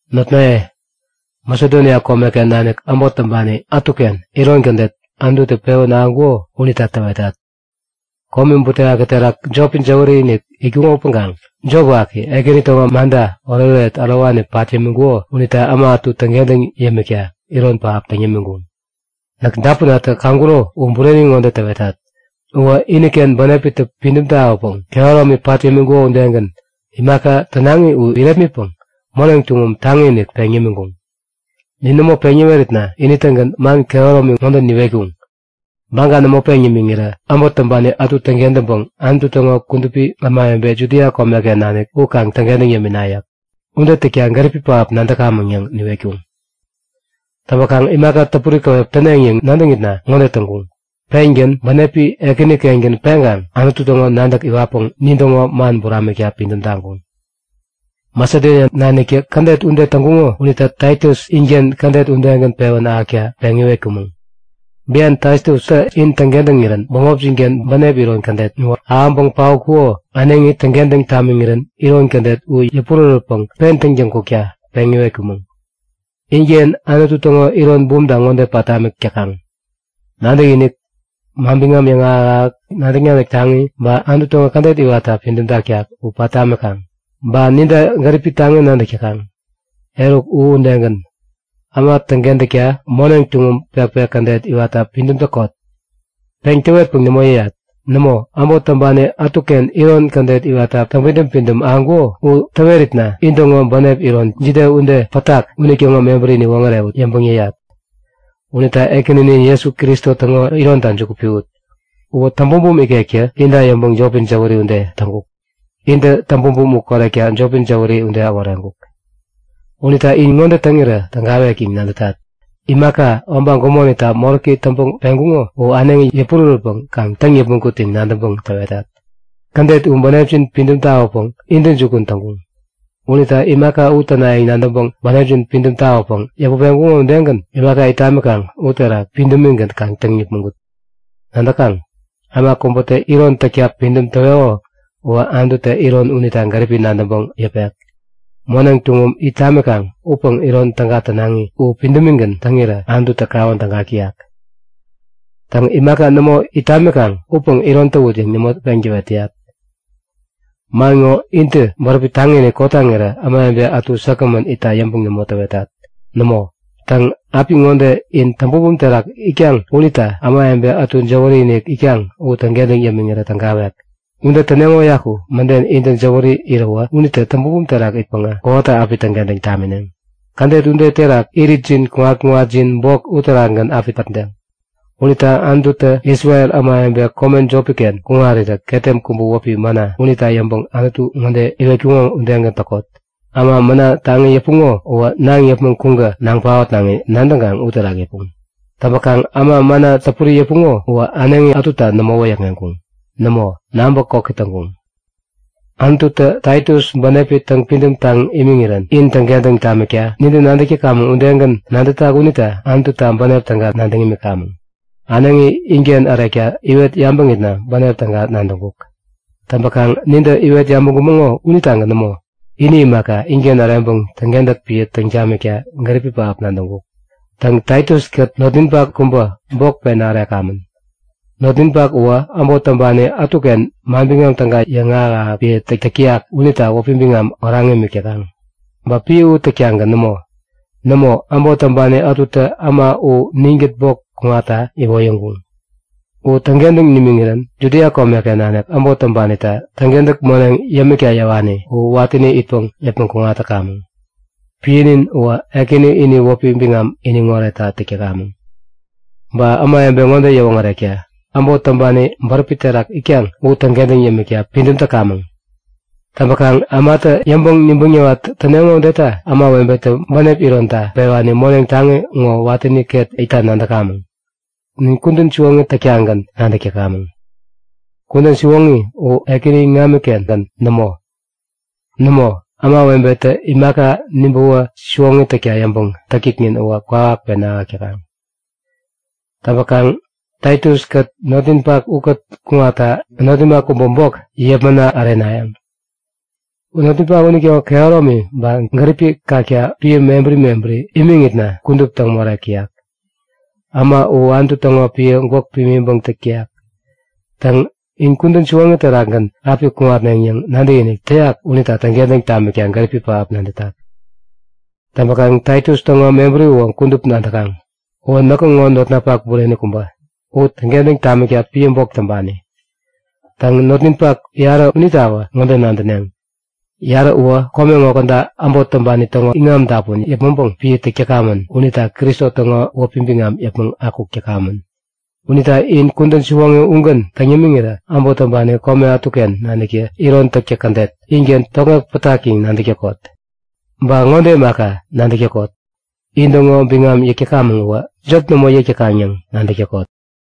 Notnaye, Masedonia komeken nanik äbot täŋpani ätuken iron kädet Anututä pewän ahäŋkuko unita täwetat; Komi butewaki terak jopi jäwäri-inik itkuŋo upäŋkaŋ jop waki Ekäni täŋo manta oretoret ärowani pat yämiŋkuko unita äma ätu täŋkentäŋ yämikta iron pähap täŋ yämiŋkuŋ. Näk dapunatä kaŋkuro u bureni ŋode täwetat; Uwä iniken bänepitä pidäm tawäpäŋ kehäromi pat yämiŋkuko udegän, imaka tänaŋi u irepmitpäŋ moneŋ tuŋum taŋi-inik peŋ yämiŋkuŋ. Nin nämo peŋ yäweritna ini-tägän man kehäromi ŋode niwetkuŋ; Baga nämo peŋ nimiŋirä äbot täŋpani ätu täŋkentäŋpäŋ Anutu täŋo kudupi ämawebe Judia komeken nanik u kaŋ täŋkentäŋ yämina! yäk. Ude täkta gäripi pähap nadäkamäŋ yäŋ niwetkuŋ. Täŋpäkaŋ imaka täpuri käwep täneŋ yäŋ nadäŋitna ŋode täŋkuŋ; Pengän bänepi Ekänikengän peŋkaŋ Anutu täŋo nadäk iwatpäŋ nintäŋo man buramikta pidäm taŋkuŋ. Masedonia naniktä kädet ude täŋkuŋo unita Taitus inken kädet udegän pewän ahäkta peŋ iwetkumäŋ. Bian Taitustä in täŋkentäŋirän bämopjin-ken bänep iron kädet u ahäŋpäŋ paotkuko äneŋi täŋkentäŋ tamiŋirän iron kädet u yäpurärätpäŋ pen täŋtäŋ kukta peŋ iwetkumäŋ. Inken Anutu täŋo iron bumta ŋode pat tamik täkaŋ; Nadäkinik, manbiŋam yäŋahäk-ahäk, nadäk-nadäk taŋi, ba Anutu täŋo kädet iwatta pidäm taktak u pat tamikaŋ. Ba ninta gäripi taŋi nadäk täkaŋ. Eruk u udegän, äma täŋkentäkta moneŋ tuŋum pekpek kädet iwatta pidäm täkot. Peŋ täwetpäŋ nämo yäyat. Nämo, äbot täŋpani ätuken iron kädet iwatta täŋpidäm-pidäm ahäŋkuko u täweritna intäŋo bänep iron jide ude pätak unitäŋo mebäri niwoŋärewut yäŋpäŋ yäyat. Unita Ekäninin Jesu Kristo täŋo ironita juku piwut. Uwä täŋbumbum ikektä inta yäŋpäŋ jopi jäwäri ude täŋkuk. Intä täŋbumbum u korekta jopi jäwäri ude äworeŋkuk. Unita in ŋode täŋirä tägawek yäŋ nadätat; Imaka obaŋ gumonita moräki täŋpäŋ peŋkuŋo u äneŋi yäpurärätpäŋ kaŋ täŋ yäpmäŋ kut yäŋ nadäŋpäŋ täwetat. Kädet u bänepjin pidäm tawäpäŋ intäjukun täŋkuŋ. Unita imaka u tänayäŋ nadäŋpäŋ bänepjin pidäm tawäpäŋ yäput peŋkuŋo udegän imaka it tamikaŋ uterak pidämigän kaŋ täŋ yäpmäŋ kut. Nadäkaŋ? Äma kubätä iron täkta pidäm täweko uwä Anututä iron unita gäripi nadäŋpäŋ yäpek. Moneŋ tuŋum it tamikaŋ upäŋ iron täga tänaŋi u pidämigän täŋirä Anututä kawän tägak täyak. Täŋ, imaka nämo it tamikaŋ upäŋ iron täwut yäŋ nämo peŋ täwet täyak. Man ŋo intä bäräpi taŋi-inik kotaŋirä ämawebe ätu säkgämän itta yäŋpäŋ nämo täwetat. Nämo. Täŋ, apiŋode in täŋbumbum terak itkaŋ unita ämawebe ätu jäwäri-inik itkaŋ u täŋkentäŋ yämiŋirä tägawek. Ude täneŋo uyaku mäden intä jäwäri iräwä unitä täŋbumbum terak itpäŋä kowata api täŋkentäŋ tamineŋ. Kädet ude terak iritjin kuŋat-kuŋatjin bok uterakgän api pätdeŋ. Unita Anututä Isrel ämawebe kome jopi-ken kuŋarirä ketem kubä wäpi mana unita yäŋpäŋ Anutu ŋode iwetkuŋo udegän täkot; Äma mana taŋi yäpuŋo uwä naŋ yäpmäŋ kuŋpäŋ naŋ paotnaŋi nadäŋkaŋ uterak yäpuŋ. Täŋpäkaŋ äma mana täpuri yäpuŋo uwä äneŋi ätuta nämo wäyäkŋeŋkuŋ. Nämo, naŋpä koki täŋkuŋ. Anututä Taitus bänepi täŋpidäm taŋ imiŋirän in täŋkentäŋ tamikta nintä nadäk täkamäŋ udegän nadätak unita Anututa bänep täga nadäŋ imikamäŋ. Äneŋi inken ärekta iwet yabäŋitna bänep täga nadäŋkuk. Täŋpäkaŋ nintä iwet yabäŋkumäŋo unitagän nämo, ini imaka, inken äreŋpäŋ täŋkentäk piä täŋ tamikta gäripi pähap nadäŋkuk. Täŋ, Taitus-kät notninpak kubä bok pena ärekamän. Notninpak uwä äbot täŋpani ätuken Manbiŋam Täga yäŋahäk-ahäk piä täk täyak unita wäpi biŋam oraŋ imik täkaŋ. Ba piä u täktagän nämo. Nämo, äbot täŋpani ätutä äma u ninkät bok kuŋatta iwoyäŋkuŋ. U täŋkentäŋ nimiŋirän Judia komeken nanik äbot täŋpanita täŋkentäk moneŋ yämikta yäwani u watäni itpäŋ yäpmäŋ kuŋat täkamäŋ. Piänin uwä Ekäni ini wäpi biŋam iniŋ oretta täk täkamäŋ. Ba ämawebe ŋode yäwoŋärekta; Äbot täŋpani bäräpi terak itkaŋ u täŋkentäŋ yämikta pidäm täkamäŋ. Täŋpäkaŋ ämatä yäŋpäŋ-nibäŋ niwat täneŋo udeta ämawebetä bänep ironta pewani moneŋ taŋi ŋo watäni ket itta nadäkamäŋ. Nin kudän siwoŋi täktagän nadäk täkamäŋ. Kudän siwoŋi u Ekäni iŋami-kengän nämo. Nämo, ämawebetä imaka, nibäwä siwoŋi täkta yäŋpäŋ täktäknin u kwawak pena ahäk täkaŋ. Täŋpäkaŋ Taitus-kät notninpak ukät kuŋatta notninpak kubä bok yepmana ärenayäŋ. Notninpak unitäŋo kehäromi ba gäripi kakta piä mebäri mebäri imiŋitna kudup täŋ morek täyak. Äma u Anutu täŋo piä gwäk pimiŋpäŋ täk täyak. Täŋ, in kudän siwoŋi terakgän api kuŋatneŋ yäŋ nadäkinik täyak unita täŋkentäŋ tamikta gäripi pähap nadätak. Täŋpäkaŋ Taitus täŋo mebäri uwä kudup nadäkaŋ. Uwä näkŋo notnapak bureni kubä, in täŋkentäŋ tamikta piä bok täŋpani. Täŋ, notninpak yarä unitawä ŋode nadäneŋ; Yarä uwä kome ŋo käda äbot täŋpani täŋo iŋam dapun yäpmäŋpäŋ piä täk täkamän unitä Kristo täŋo wäpi biŋam yäpmäŋ akuk täkamän. Unita in kudän siwoŋi ugän täŋ yämiŋirä äbot täŋpani kome ätuken naniktä iron täktäk kädet inken tokŋek pätak yäŋ nadäk täkot. Ba ŋode imaka, nadäk täkot; In-täŋo biŋam yäk täkamäŋ uwä jop nämo yäk täkaŋ yäŋ nadäk täkot.